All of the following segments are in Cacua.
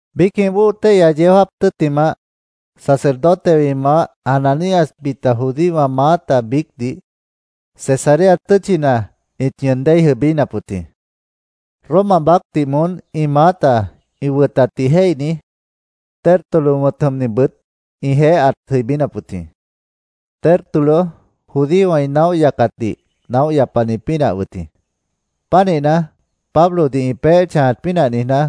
Biícjĩh bóo téihya yeó jáap tʉ́ttimah, sacerdotewã ĩ maáh Ananías, bita judíowã maáta biícdih Cesarea tʉ́tchina ĩt ñʉʉn déi jʉibínap wʉt jĩ. Roma baácdih moón ĩ maáta ĩ wʉtatdih jéihni Tértulo wʉ̃t jʉmnibʉt ĩjeéh ãt jʉibínap wʉt jĩ. Tértulo judíowã ĩ naóh yacatdih naóh yapani pínah wʉt jĩ. Pánihna, Pablodih ĩ peéh chãjat pínah niijná,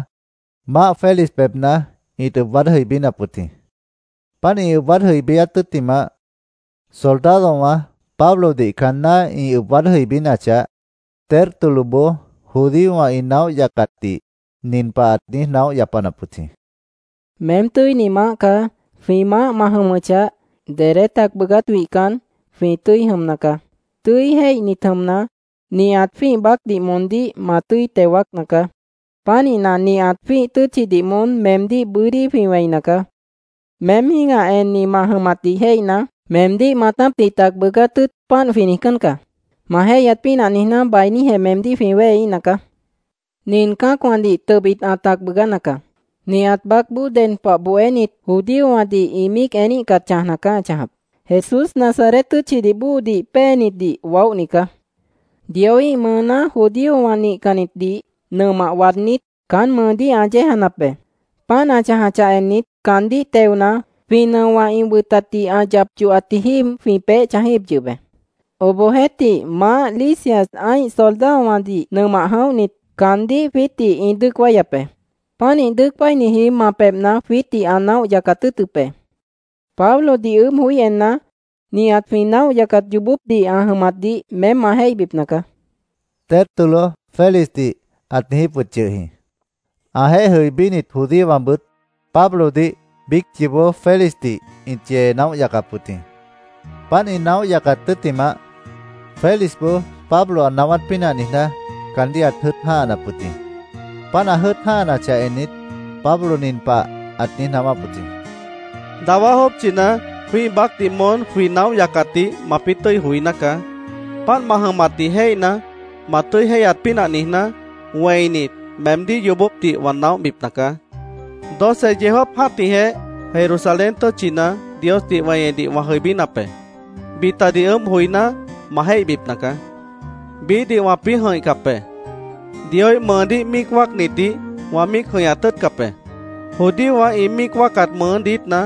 Maáh Félix pebhna ĩt waad jʉibínap wʉt jĩ. Páant ĩ waád jʉibíát tʉ́ttimah, soldadowã Pablodih caanná ĩ ʉb waád jʉibínachah, Tértuloboó judíowã ĩ naóh yacatdih nin pah ãt niíj naóh yapanap wʉt jĩ: —Meém tʉ́ini maáh caá. Jwĩ maáh ma jʉmʉchah, dedé tac bʉʉgát wihcan, jwĩ tʉ́i jʉmna caá. Tʉ́i jéihni jʉmna, nihat jwĩ́ih baácdih moondíh ma tʉ́i teo wáacna caá. Pánihna, nihat jwĩ́ih tʉ́tchidih moón meemdíh bʉ́dí jwĩ wẽina caá. Meém jĩ́gah enni ma jʉmatdih jéihna, meemdíh maatápdih tac bʉʉgáát tʉ́ʉt páant jwĩ niijcán caá. Ma jéihyat pínah niijná, bainíjeh meemdíh jwĩ wéheíhna caá. Nin cã́acwãdih tʉbit ã tac bʉʉgána caá. Nihat baácboó ded pah bohénit, judíowãdih ĩ míic eníhcat chãjna caá ã chãjap. Jesús Nazaret tʉ́tchidih bóodih péenitdih waóhni caá. Dioíh mʉʉná judíowã nihcannitdih nʉmah waadnít, caán mʉʉdíh ã yéejanap be. Páant ã chãjachah ennit, caandíh teona, jwĩ nʉowã ĩ wʉtatdih ã yap yohatji jíib jwĩ peéh chãjíhip yʉh be. Obohjeéhtih, maáh Lisias ã́ih soldadowãdih nʉmah jʉ̃óhnit, caandíh jwiítdih ĩ dʉ́ʉc wáyap be. Pánih dʉ́ʉc wáiniji ma pebhna jwiítdih ã naóh yacat tʉ́ʉtʉp be. Pablodih ʉʉ́bh joí enna, nihat jwĩ naóh yacat yoobópdih ã jʉmatdih meém ma jéihbipna caá, Tértulo Félixdih ãt niijíp wʉt yʉh jĩ. Ãjeéh jʉibínit judíowãbʉt Pablodih biíc yoobó Félixdih ĩt yee naóh yacap wʉt jĩ. Páant ĩ naóh yacat tʉ́ttimah, Félixboó Pablo ã naáwát pínah niijná, caandíh ãt jʉ́ʉt jã́hanap wʉt jĩ. Páant ã jʉ́ʉt jã́hanachah ennit, Pablo nin pah ãt niíj naáwáp wʉt jĩ: —Dawá jópchina jwĩ́ih baácdih moón jwĩ naóh yacatdih mapĩ́ tʉ́i joiná caá. Páant ma jʉmatdih jéihna, ma tʉ́i jéihyat pínah niijná, wẽinit, meemdíh yoobópdih wã naóhbipna caá. Doce yeó jáap jã́tihjeh Jerusalén tʉ́tchina Diosdih weñedih wã jʉibínap be. Bitadih ʉʉ́bh joiná, ma jéihbipna caá. Biíhdih wãpĩ́ jʉ̃ihcap be. Dioíh mʉʉdíh míic wáacnitdih wã míic jʉ̃ihñat tʉ́ʉtcap be. Judíowã ĩ míic wáacat mʉʉ́ diítna,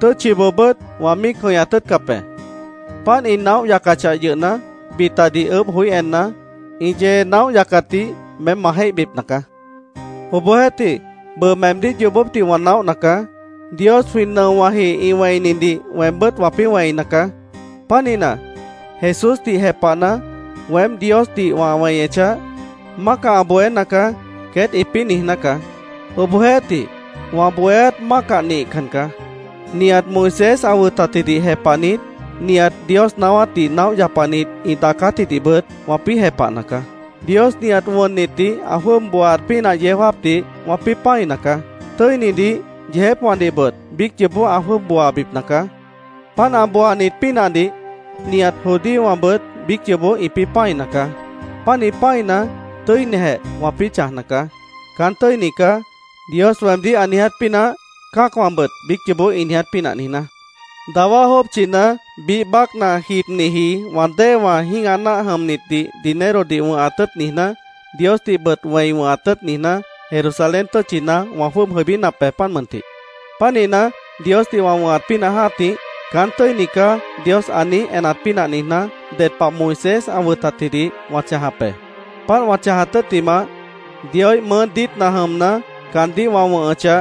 tʉ́tchiboobʉ́t wã míic jʉ̃ihñat tʉ́ʉtcap be. Páant ĩ naóh yacachah yʉhna, bitadih ʉʉ́bh joí enna, ĩ yee naóh yacatdih meém ma jéihbipna caá. Obohjeéhtih, bʉʉ meemdíh yoobópdih wã naóhna caá. Dios jwĩ nʉowãji ĩ wẽinidih weembʉ́t wãpĩ́ wẽina caá. Pánihna, Jesúsdih jepahna, weém Diosdih wã weñechah, ‘Mácah ã bohéna caá’, queét ĩpĩ́ niijná caá. Obohjeéhtih, wã bohéát mácah nihcan caá. Nihat Moisés ã wʉtatjidih jepahnit, nihat Dios naáwátdih naóh yapanit ĩ daacátjidihbʉt wãpĩ́ jepahna caá. Dios nihat wʉnnitdih ã jwʉ́ʉb booaat pínah yeó jáapdih wãpĩ́ pã́ina caá. Tʉ́initdih, yeejépwãdihbʉt biíc yoobó ã jwʉ́ʉb booabipna caá. Páant ã booaat pínahdih nihat judíowãbʉt biíc yoobó ĩpĩ́ pã́ina caá. Pánih pã́ina, tʉ́inijeh wãpĩ́ chãjna caá, ‘Caán tʉ́ini caá’, Dios weemdíh ã niiját pínah, cã́acwãbʉt biíc yoobó ĩ niiját pínah niijná. “Dawá jópchina biíh baácna jibniji wã déewã jĩ́gah náah jʉmnitdih dinerodih wʉ̃hat tʉ́ʉt niijná, Diosdihbʉt wẽi wʉ̃hat tʉ́ʉt niijná, Jerusalén tʉ́tchina wã jwʉ́ʉb jʉibínap be, páant mʉntih. Pánihna, Diosdih wã wʉ̃hat pínah jã́tih, ‘Caán tʉ́ini caá’, Dios ã niíj enat pínah niijná, ded pah Moisés ã wʉtatjidih wã chãjap be. Páant wã chãjat tʉ́ttimah, Dioíh mʉʉ́ diítna jʉmna, caandíh wã wʉ̃hʉchah,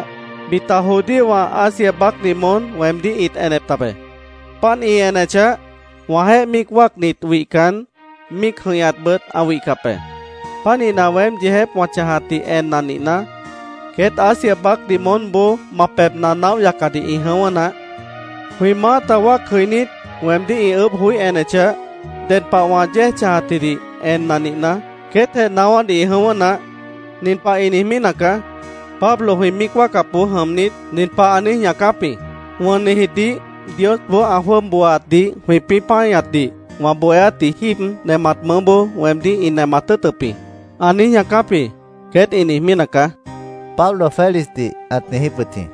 bita judíowã Asia baácdih moón weemdíh ĩt enep tabe. Páant ĩ enechah, wãjeéh míic wáacnit wihcan, míic jʉ̃ihñatbʉt ã wihcap be. Pánihna, weém yeejép wã chãjatdih enna nihna, queét Asia baácdih moónboó ma pebhna naóh yacadih ĩ jʉ̃ʉ́wʉ́ naáh. Jwĩ maáta wáac jʉinít, weemdíh ĩ ʉʉ́bh joí enechah, ded pah wã yéej chãjatjidih enna nihna, queétjeh naáwádih ĩ jʉ̃ʉ́wʉ́ naáh. Nin pahjeh ĩ niijmí nacaá: ‘Pablo jwĩ míic wáacapboó jʉmnit, nin pah ã niíj ñaacáp jĩ: “Wʉnnitjidih Diosboó ã jwʉ́ʉb booaatdih jwĩpĩ́ páñatdih wã bohéátji jíib nemat mʉʉ́boó weemdíh ĩ nemat tʉ́ʉtʉp jĩ”, ã niíj ñaacáp jĩ’, queét ĩ niijmí nacaá”, Pablo Félixdih ãt niijíp wʉt jĩ.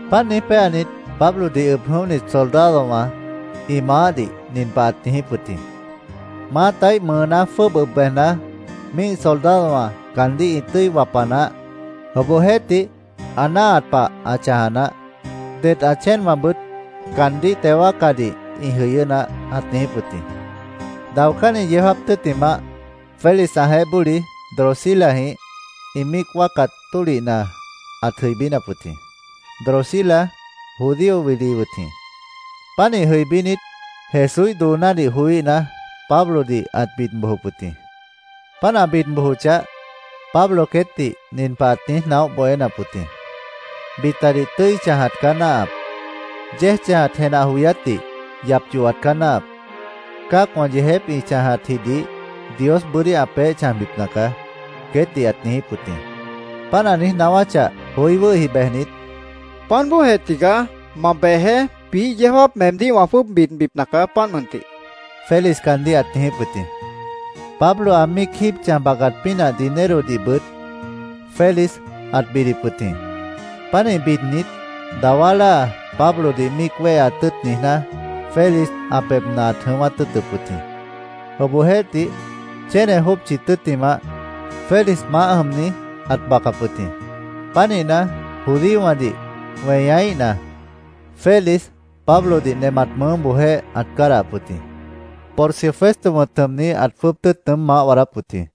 Páant niíj péanit, Pablodih ʉb jʉ̃óhni soldadowã ĩ maáhdih nin pah ãt niijíp wʉt jĩ: “Maátaíh mʉʉná jwʉ́ʉb ʉb bejna, míih soldadowã caandíh ĩ tʉ́i wapa naáh. Obohjeéhtih, ã náahat pah ã chãja naáh. Det ã chéenwãbʉt caandíh teo wáacadih ĩ jʉyʉ́ naáh”, ãt niijíp wʉt jĩ. Daocánni yeó jáap tʉ́ttimah, Félix ãjeéh bóli Drusilajĩh ĩ míic wáacat tólihna ãt jʉibínap wʉt jĩ. Drusila judío wili wʉt jĩ. Pánih jʉibínit, Jesúíh doonádih joííhna, Pablodih ãt bid bojop wʉt jĩ. Páant ã bid bojochah, Pablo queétdih nin pah ãt niíj naóh bohénap wʉt jĩ: “Bitadih tʉ́i chãjat caá náahap. Yéej chãjat jenah joyátdih yap yohat caá náahap. Cã́acwã yeejép ĩ chãjatjidih Dios bʉ́dí ã peéh chãjbipna caá”, queétdih ãt niijíp wʉt jĩ. Páant ã niíj naáwáchah, joí wʉ́hi bejnit, —Páant bóojeh tigaá. Ma bejeé. Biíh yeó jáap meemdíh wã jwʉ́ʉb bidbipna caá, páant mʉntih, Félix caandíh ãt niijíp wʉt jĩ. Pablo ã míic jíib chãj bacat pínah dinerodihbʉt Félix ãt bidip wʉt jĩ. Pánih bidnit, dawá láa Pablodih míic wéheat tʉ́ʉt niijná, Félix ã pebhna ãt jʉ̃ʉ́wát tʉ́ʉtʉp wʉt jĩ. Obohjeéhtih, chéne jópchi tʉ́ttimah, Félix maáh jʉmni ãt bacap wʉt jĩ. Pánihna, judíowãdih weñaíhna, Félix Pablodih nemat mʉʉ́boojéh ãt cádahap wʉt jĩ. Porcio Festo wʉ̃t jʉmni ãt jwʉ́ʉb tʉ́ʉt nʉʉ́m maáh waadáp wʉt jĩ.